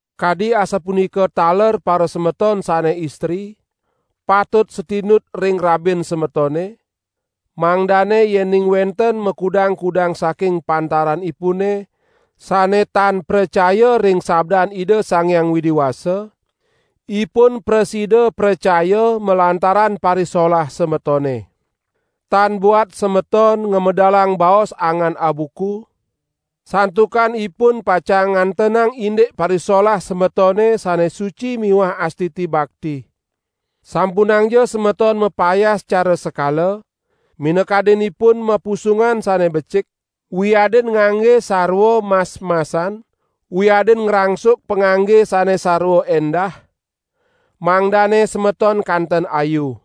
Kadi asapunika taler parasemeton sane istri, patut satinut ring rabin semetone, mangdane yening wenten makudang-kudang saking pantaranipune sane tan pracaya ring sabdan Ida Sang Hyang Widi Wasa, ipun prasida pracaya malantaran parisolah semetone. Tan buat semeton ngamedalang baos angan abuku, santukan ipun pacang ngantenang indik parisolah semetone sane suci miwah astiti bakti. Sampunangja semeton mapayas cara sekala, minakadinipun mapusungan sane becik, wiadin ngangge sarwa mas-masan, wiadin ngrangsuk pangangge sane sarwa endah mangdane semeton kanten ayu.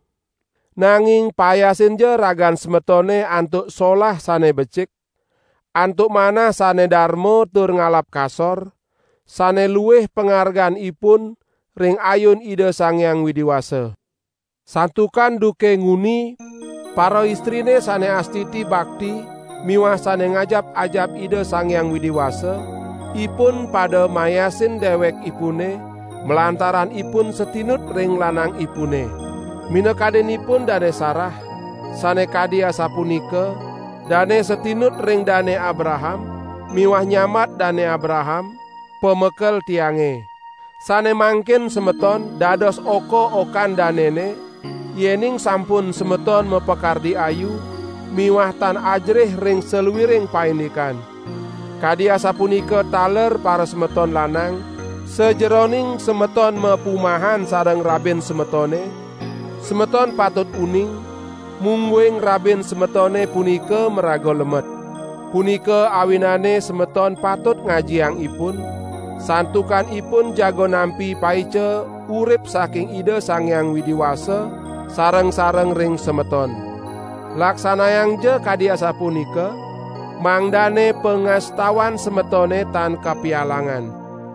Nanging payasinja ragan semetone antuk solah sane becik, antuk manah sane darma tur ngalap kasor, sane luih pangarganipun ring ayun Ida Sang Hyang Widi Wasa. Santukan duke nguni paraistrine sane astiti bakti miwah sane ngajap-ajap Ida Sang Hyang Widi Wasa, ipun pada mayasin dewekipune malantaran ipun satinut ring lanangipune. Minakadinipun Dane Sarah, sane kadi asapunika; dane satinut ring Dane Abraham miwah nyambat Dane Abraham "pamekel tiange". Sane mangkin semeton dados oka-okan danene, yening sampun semeton mapakardi ayu miwah tan ajerih ring saluiring paindikan. Kadi asapunika taler parasemeton lanang, sajeroning semeton mapumahan sareng rabin semetone, semeton patut uning, mungguing rabin semetone punika maraga lemet. Punika awinane semeton patut ngajiang ipun, santukan ipun jaga nampi paica urip saking Ida Sang Hyang Widi Wasa sareng-sareng ring semeton. Laksanayangja kadi asapunika, mangdane pangastawan semetone tan kapialangan.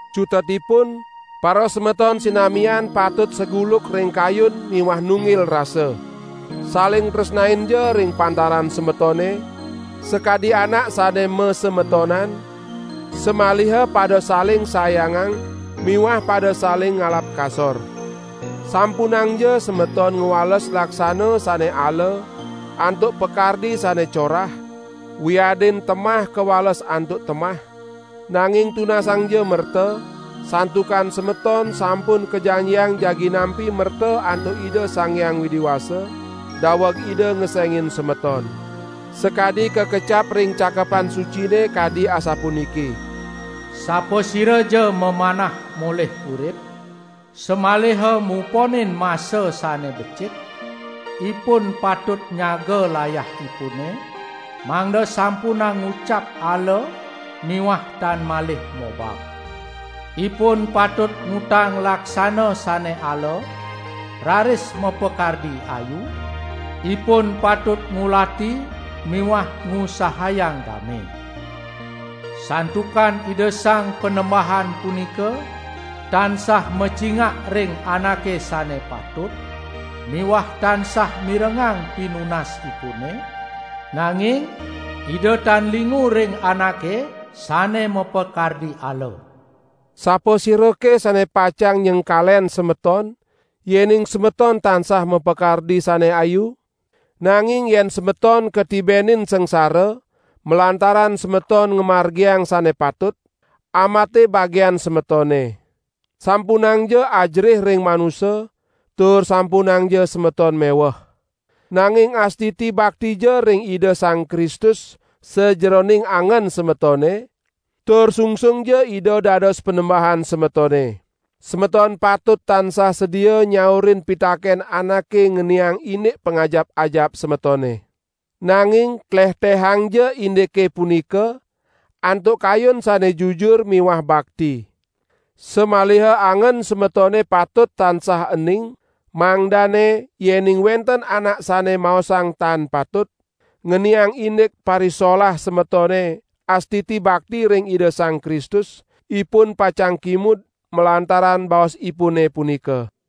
Cutetipun; parasemeton sinamian patut saguluk ring kayun miwah nunggil rasa. Saling tresnainja ring pantaran semetone, sakadi anak sane masemetonan, samaliha pada saling sayangang miwah pada saling ngalap kasor. Sampunangja semeton ngwales laksana sane ala antuk pakardi sane corah, wiadin temah kawales antuk temah, nanging tunasangja merta, santukan semeton sampun kajanjiang jagi nampi merta antuk Ida Sang Hyang Widi Wasa, daweg Ida ngesengin semeton. Sakadi kakecap ring Cakepan Sucine kadi asapuniki: "Sapasiraja mamanah molih urip, samaliha muponin masa sane becik, ipun patut nyaga layahipune mangda sampunang ngucap ala miwah tan malih mobab. Ipun patut ngutang laksana sane ala raris mapakardi ayu, ipun patut ngulati miwah ngusahayang dame. Santukan Ida Sang Panembahan punika tansah macingak ring anake sane patut, miwah tansah mirengang pinunasipune, nanging Ida tan lingu ring anake sane mapakardi ala." Sapasirake sane pacang nyengkalen semeton, yening semeton tansah mapakardi sane ayu? Nanging yen semeton katibenin sangsara malantaran semeton ngamargiang sane patut, ambate bagian semetone. Sampunangja ajerih ring manusa tur sampunangja semeton meweh. Nanging astiti baktija ring Ida Sang Kristus sajeroning angen semetone tur sungsungja Ida dados Panembahan semetone. Semeton patut tansah sedia nyaurin pitaken anake ngeniang indik pangajap-ajap semetone. Nanging tlehtehangja indike punika antuk kayun sane jujur miwah bakti. Samaliha angen semetone patut tansah ening, mangdane yening wenten anak sane maosang tan patut ngeniang indik parisolah semetone astiti bakti ring Ida Sang Kristus, ipun pacang kimud malantaran baosipune punika.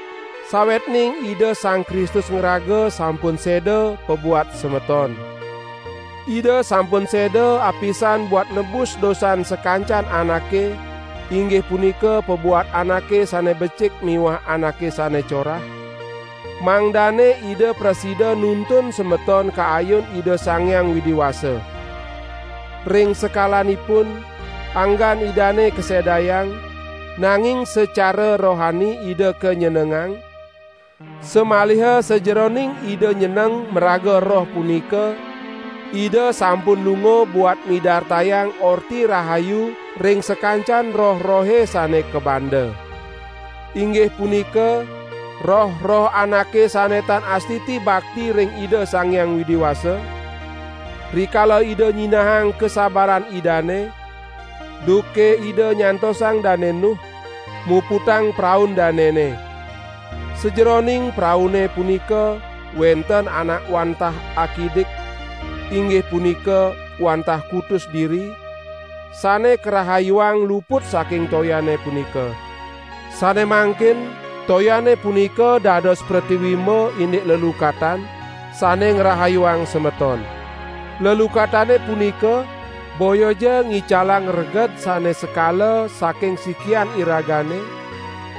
Sawetning Ida Sang Kristus ngraga sampun seda pabuat semeton. Ida sampun seda apisan buat nebus dosan sakancan anake, inggih punika pabuat anake sane becik miwah anake sane corah, mangdane Ida prasida nuntun semeton ka ayun Ida Sang Hyang Widi Wasa. Ring sekalanipun, anggan Idane kasedayang, nanging secara rohani Ida kanyenengang, samaliha sajeroning Ida nyeneng maraga Roh punika, Ida sampun lunga buat midartayang Orti Rahayu ring sakancan roh-rohe sane kabanda. Inggih punika roh-roh anake sane tan astiti bakti ring Ida Sang Hyang Widi Wasa, rikala Ida nyinahang kasabaran Idane, duke Ida nyantosang Dane Nuh muputang praun danene. Sajeroning praune punika wenten anak wantah akidik, inggih punika wantah kutus diri, sane karahayuang luput saking toyane punika. Sane mangkin toyane punika dados pretiwimba indik lelukatan, sane ngrahayuang semeton. Lelukatane punika boyaja ngicalang reged sane sekala saking sikian iragane,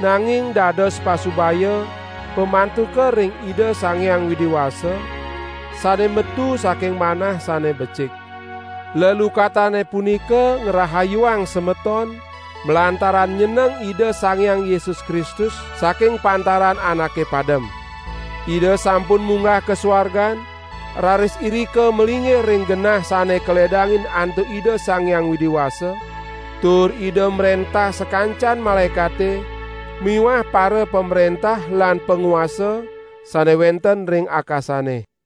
nanging dados pasubaya pamantuka ring Ida Sang Hyang Widi Wasa sane metu saking manah sane becik. Lelukatane punika ngrahayuang semeton malantaran nyeneng Ida Sang Hyang Yesus Kristus saking pantaran anake padem. Ida sampun munggah ka suargan, raris irika malinggih ring genah sane kaledangin antuk Ida Sang Hyang Widi Wasa, tur Ida mrentah sakancan malaekate miwah parapamrentah lan panguasa sane wenten ring akasane.